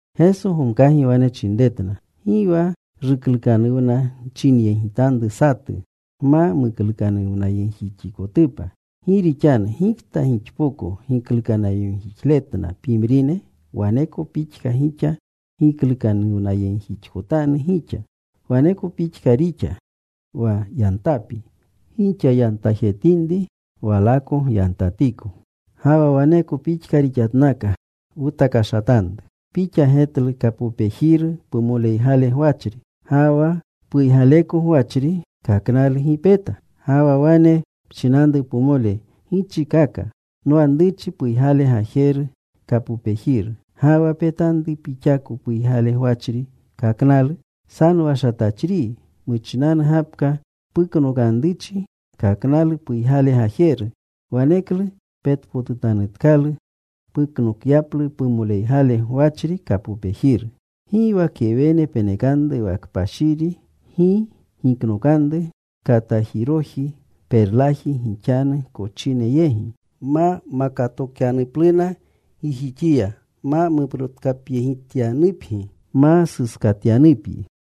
Geso gomkagi wane chinretna, “Gi wa ruklukanuwna nchinyegitanru satu, gma muklukanuwnayegjixikotupa. Gi rixanu gikta gixpoko giklukanuwnayegjixletna pimrine, waneko pixka gixa giklukanuwnayegjixkotanu gixa. Waneko pixka rixa: Wa yantapi gixa yantajetinri, walako gyantatiko. “Ga wa waneko pixka rixatnaka. Wutakashatanru: Pixa getlu kapopejiru pumoleygale gwachri, ga wa ¿puygaleko gwachri kaknalu gi peta? Ga wa wane pchinanru pumole, ‘Gichikaka. Nwanruchi puygale gajeru kapopejiru.’ ¡Ga wa petanru pixako puygale gwachri kaknalu! ¡Sanowashatachriyi! Muchinanu gapka puknokanruchi kaknalu puygale gajeru. Waneklu petpotutanutkalu puknokyaplu pumoleygale gwachri kapopejiru. “Gi wa kewene penekanru wa kpashiri. Gi giknokanru katajiroji perlaji gixanu kochine yegi, ma makatokyanupluna gijixiya, ma muprotkapyegityanupgi, ma suskatyanupgi.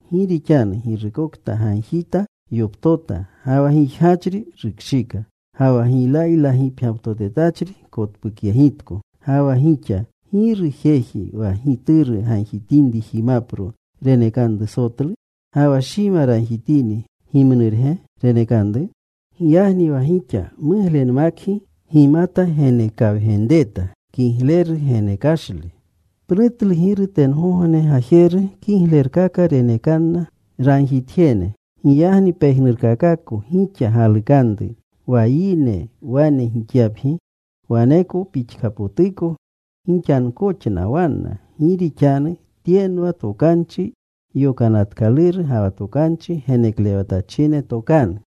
Gi rixanu girukokta gagjita, yoptota. Ga wa gijgachri rukshika. Ga wa giylaylagipgyaptotetachri kotpukyegitko. “Ga wa gixa, ¿giru jeji wa gituru gagjitinri jimapro, renekanru sotlu? Ga wa shima ragjitini, ¿gimnurge renekanru? Giyagni wa gixa muglenmakgi gimata genekawgenreta kigleru genekashle, pnutlu Giru tengogne Gajeru kiglerkaka renekanna ragjitjene. Giyagni pejnurkakako gixa galukanru wa yine wane gixyapgi, waneko pixkapotuko gixankoxna wanna. Gi rixanu tyenwa tokanchi yokanatkaluru ga wa tokanchi geneklewatachine tokanu.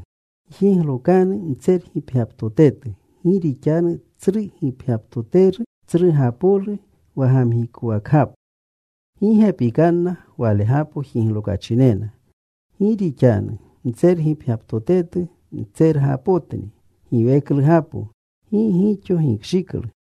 “Gjiglokanu mtsergipgyaptotetu. Gi rixanu tsru gipgyaptoteru, tsrugapolu wa gamgikowakgapo. Gi gepikanna walegapo jiglokachinena. Gi rixanu mtsergipgyaptotetu, mtsergapotni giweklugapo. Gi gixo gikshiklu.”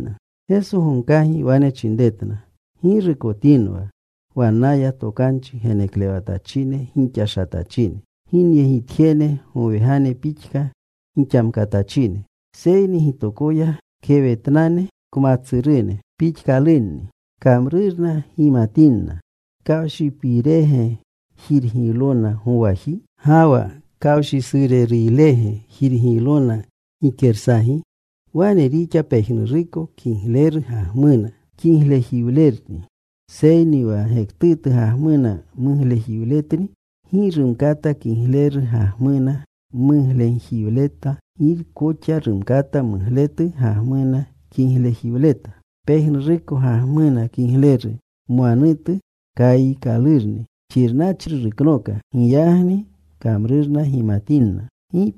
Geso gomkagi wane chinretna, “Ggirukotinwa wannaya tokanchi geneklewatachine gixashatachine, ginyegitjene gowegane pixka gixamkatachine, seyni gitokoya kewetnane kmatsurune pixkalunni. Kamrurna gimatinna. ¿Kawshipirege jirgiylona gowaji? Ga wa ¿kawshisureruylege jirgiylona gikersagi? Wane rixa pejnuruko kigleru gagmuna, kiglejiwlerni. Seyni wa gektutu gagmuna muglejiwletni. Gi rumkata kigleru gagmuna muglenjiwleta. Gi koxa rumkata mugletu gagmuna kiglejiwleta. Pejnuruko gagmuna kiglejiru mwanutu kayiikalurni. Xirnachri ruknooka. Giyagni kamrurna gimatinna.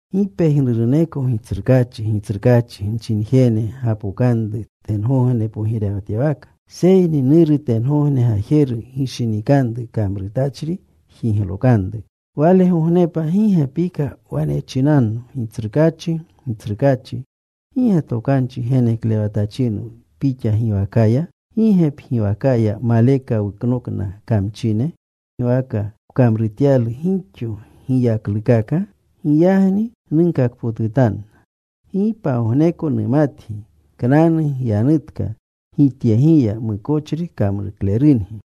“Gi pejnuruneko ‘Gitsrukaachi, Gitsrukaachi’ nchinjene gapokanru tengogne pogirewatyawaka. Seyni Nuru tengogne Gajeru gishinikanru kamrutachri, jiglokanru. Walegognepa gi gepika wane chinanno, ‘Gitsrukaachi, Gitsrukaachi ¿gi ge tokanchi geneklewatachinwu Pixa giwakaya? ¿Gi ge pgiwakaya maleka wuknokna kamchine?’ ¿Gi ge pgiwaka wkamrutyalu gixo giyaklukaka? Giyagni nunkakpotutanna, ‘Gi pagogneko numatgi. Knanu gyanutka Gityegiya, mukochri kamruklerungi.’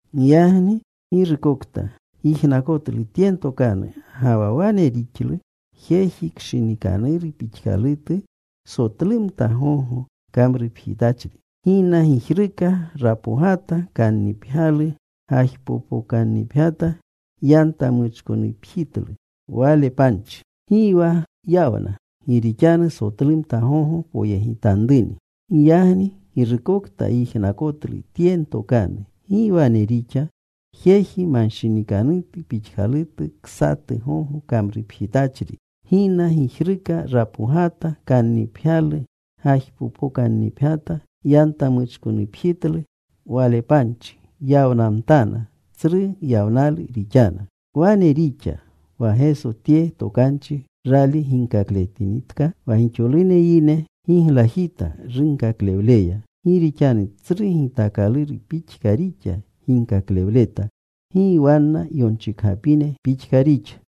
“Giyagni girukokta yijnakotlu tye ntokanu, ga wa wane rixlu, jeji kshinikanuru pixkalutu, sotlumta gogo kamrupjitachri. Gina gijruka. Rapogata. Kannipgyalu gajpopokannipgyata. Yantamuchkonupjitlu wale panchi. Gi wa yawna, gi rixanu sotlumta gogo poyegitanruni. Giyagni girukokta yijnakotlu tye ntokanu, gi wane rixa, jeji manshinikanutu pixkalutu, ksatu gogo kamrupjitachri. Gina gijruka. Rapogata. Kannipgyalu gajpopokannipgyata. Yantamuchkonupjitlu wale panchi. Yawnamtana. Tsru yawnalu rixana.” Wane rixa. Wa Geso tye tokanchi rali ginkakletinitka, wa gixolune yine giglajita runkakaklewleya. Gi rixanu tsru gitaakaluru pixka rixa ginkaklewleta. Gi wanna yonchikgapine pixka rixa.